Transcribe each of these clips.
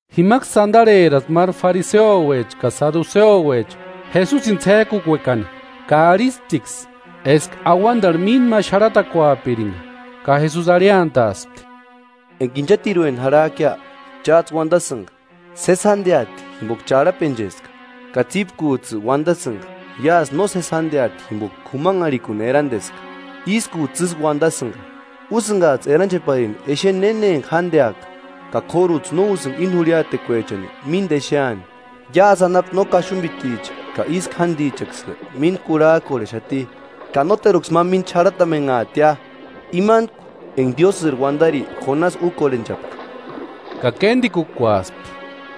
Jimaksï antarheraspti máru fariseuecha ka saduseuecha Jesusini ts'ék'ukuekani, ka arhisptiksï eska auantarhu mínta ma xarhatakuapirinka. Ka Jesusi arhiantaaspti: “Enka inchatirueni jarhak'ia, cháts'ï uantasïnka: ‘Sési jánteati jimpoka charhapencheska.’ Ka tsípkuts'ï uantasïnka: ‘¡Iásï nósesi jánteati jimpoka k'umanharhikuni eranteska!’ ¡Ískuts'ï ísï uantasïnka. Úsïnkats'ï erancheparini exeni néna enka jánteaka, ka k'óruts'ï no úsïnka íni jurhiatekuechani mínta exeani! Iásï anapu no kaxumpiticha ka ísku jántichaksï mínta kurhak'orhexati. Ka nóteruksï ma mínta xarhatamenhaatia, imantku enka Diósïri uantari Jonasi úkorhenchapka.” Ka kéntikukuaspti.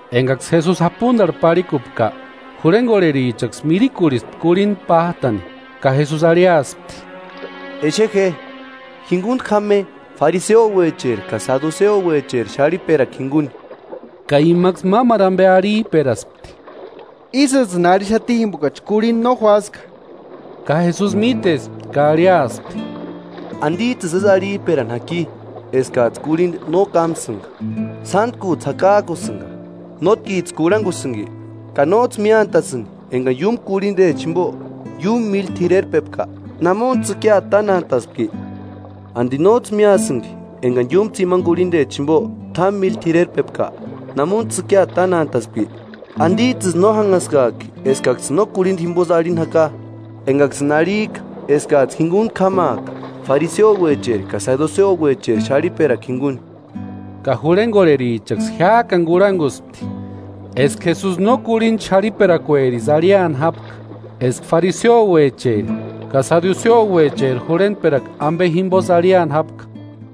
Enkaksï Jesusi japuntarhu parhikupka, jurhenkorherichaksï mirikurhispti kurhinta pát'ani. Ka Jesusi arhiaspti: “Exe je, jinkuntku jáma je fariseuecheri ka saduseuecheri xarhiperakua jinkuni.” Ka imaksï mámaru ampe arhip'eraspti: “Ísïts'ïni arhixati jimpokachi kurhinta no juáska.” Ka Jesusi mítespti ka arhiaspti: “¿Antits'ïsï ísï arhip'erani jaki eskats'ï kurhinta no kámsïnka? ¡Sántkuts'ï jakak'usïnka! ¿Nótkits'ï kurhankusïnki ka nóts'ï míantasïnki enkani iúmu kurhintechani jimpo, iúmu míli t'irerpepka?, ¿Namuntsï tsïkiata tánantaaspki? ¿Anti nóts'ï míasïnki enkani iúmu tsimani kurhintechani jimpo, t'ámu míli t'irerpepka? ¿Namuntsï tsïkiata tánataaspki? ¿Antits'ïsï no jánhaskak'i eskaksïni no kurhinta jimposï arhini jaka? Enkaksïni arhik'a eskats'ï jinkuntku jámaaka fariseuecheri ka saduseuecheri xarhiperakua jinkuni.” Ka jurhenkorherichaksï jiák'ani kurhankuspti eska Jesusi no kurhinta xarhiperakuerisï arhiani jápka, eska fariseuecheri ka saduseuecheri jurhentperakua ampe jimposï arhiani jápka.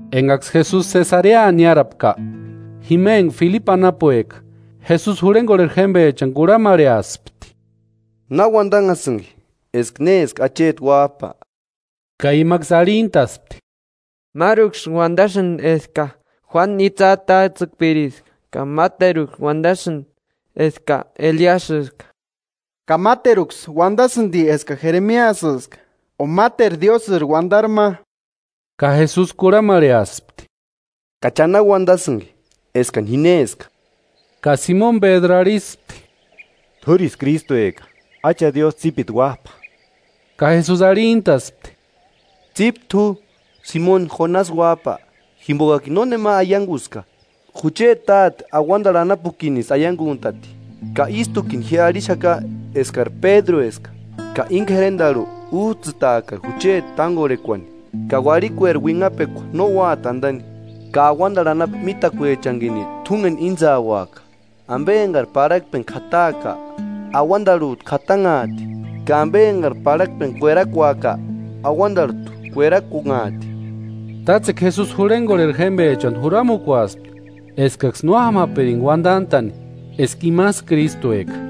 Enkaksï Jesusi Sesarea niárapka, jima enka Filipu anapueka, Jesusi jurhenkorheri jémpechani kurhamarheaspti: “¿Na uantanhasïnki eska néska Acheti Uáp'a?” Ka imaksï arhintaspti: “Máruksï uantasïnti eska Juánu itsï atats'ïkpiriska, ka máteruksï uantasïnti eska Eliasïska, ka máteruksï uantasïnti eska Jeremiasïska o máteru Diósïri uantari ma.” Ka Jesusi kurhamarheaspti: “¿Ka cha na uantasïnki eskani ji néska?” Ka Simoni Pédru arhispti; “T'úrisï Krístueka, Acha Diósï tsípiti Uáp'a.” Ka Jesusi arhintaspti: “Tsípe t'u, Simoni Jonasi uáp'a, jimpokakini nónema aiankuska, jucheti Táte auantarhu anapukinisï aiankunt'ati. Ka ístukini ji arhixaka eskari Pédrueska ka íni k'erentarhu úts'ïtaaka jucheti tánkorhekuani, ka uarhikueri uinhapekua no úati antani. Ka auantarhu anapu mítakuechanikini t'únkeni íntsauaka: Ampe enkari parhakpeni k'ataaka, auantarhut'u k'atanhaati, ka ampe enkari parhakpeni kuerakuaka, auantarhut'u kuerakunhaati.” Tátsekua Jesusi jurhenkorheri jémpechani juramukuaspti eskaksï no jámapirinka uantant'a'ni eska imasï Krístueka.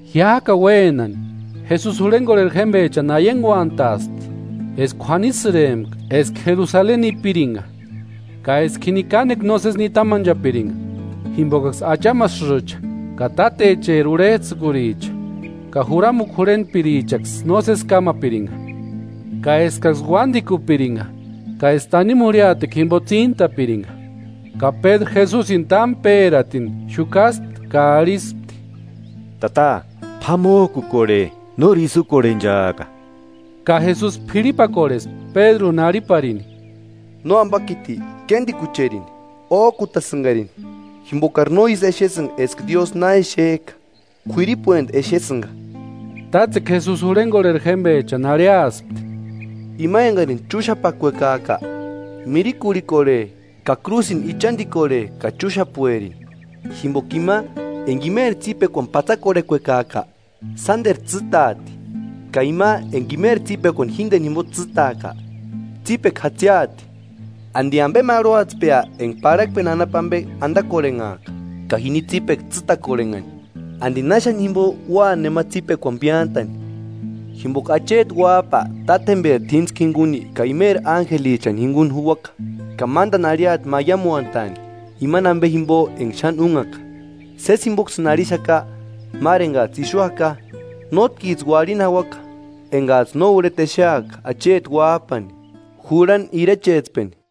Jiák'ani uénani Jesusi jurhenkorheri jémpechani aiankuant'aspti eska k'uanisïrempka eska Jerusaleni nipiranka, ka eska jini kánekua nósesi nitamanchapirinka, jimpokaksï achamasïcha ka tátecheri urhets'ïkuricha ka juramukua jurhentpirichaksï nósesi kámapirinka, ka eskaksï uántikupirinka ka eska tanimu jurhiatekua jimpo tsíntapirinka. Ka Pédru Jesusini támu pératini xukaspti ka arhispti: “Tata, p'amok'ukorhe ¡Nóri ísï úkorhenchaaka!” Ka Jesusi p'irhipakorhespti Pédruni arhiparini: “¡Nóampakiti, kéntikucherini! Ók'utasïnkarini jimpokari no ísï exesïnka eska Diósï na exek'a, k'uiripuenti exesïnka.” Tátsekua Jesusi jurhenkorheri jémpechani arhiaspti: “Ima enkarini chúxapakuekaaka, mirikurhikorhe, ka krúsini ichantikorhe ka chúxapuerini. Jimpoka ima enka imeri tsípekuani pátsakorhekuekaaka, sánteru tsîtaati, ka ima enka imeri tsípekuani jínteni jimpo tsîtaaka, tsípekua jatsiati. ¿Anti ampe marhuatspea enka parhakpeni anapu ampe antakorhenhaaka, ka jini tsípekua tsîtakorhenhani? ¿Anti náxani jimpo ua nema tsípekuani piántani? Jimpoka Acheti Uáp'a Tátjemperi t'íntskua jinkuni ka imeri ánjelichani jinkuni juuaka, ka mántani arhiati maiamuantaani imani ampe jimpo enka xáni únhaka. Sési jimpoksïni arhixaka máru enkats'ï ixu jaka, nótkits'ï uarhini jauaka enkats'ï no urheta exeaka Acheti Uáp'ani jurhani irechetspeni.”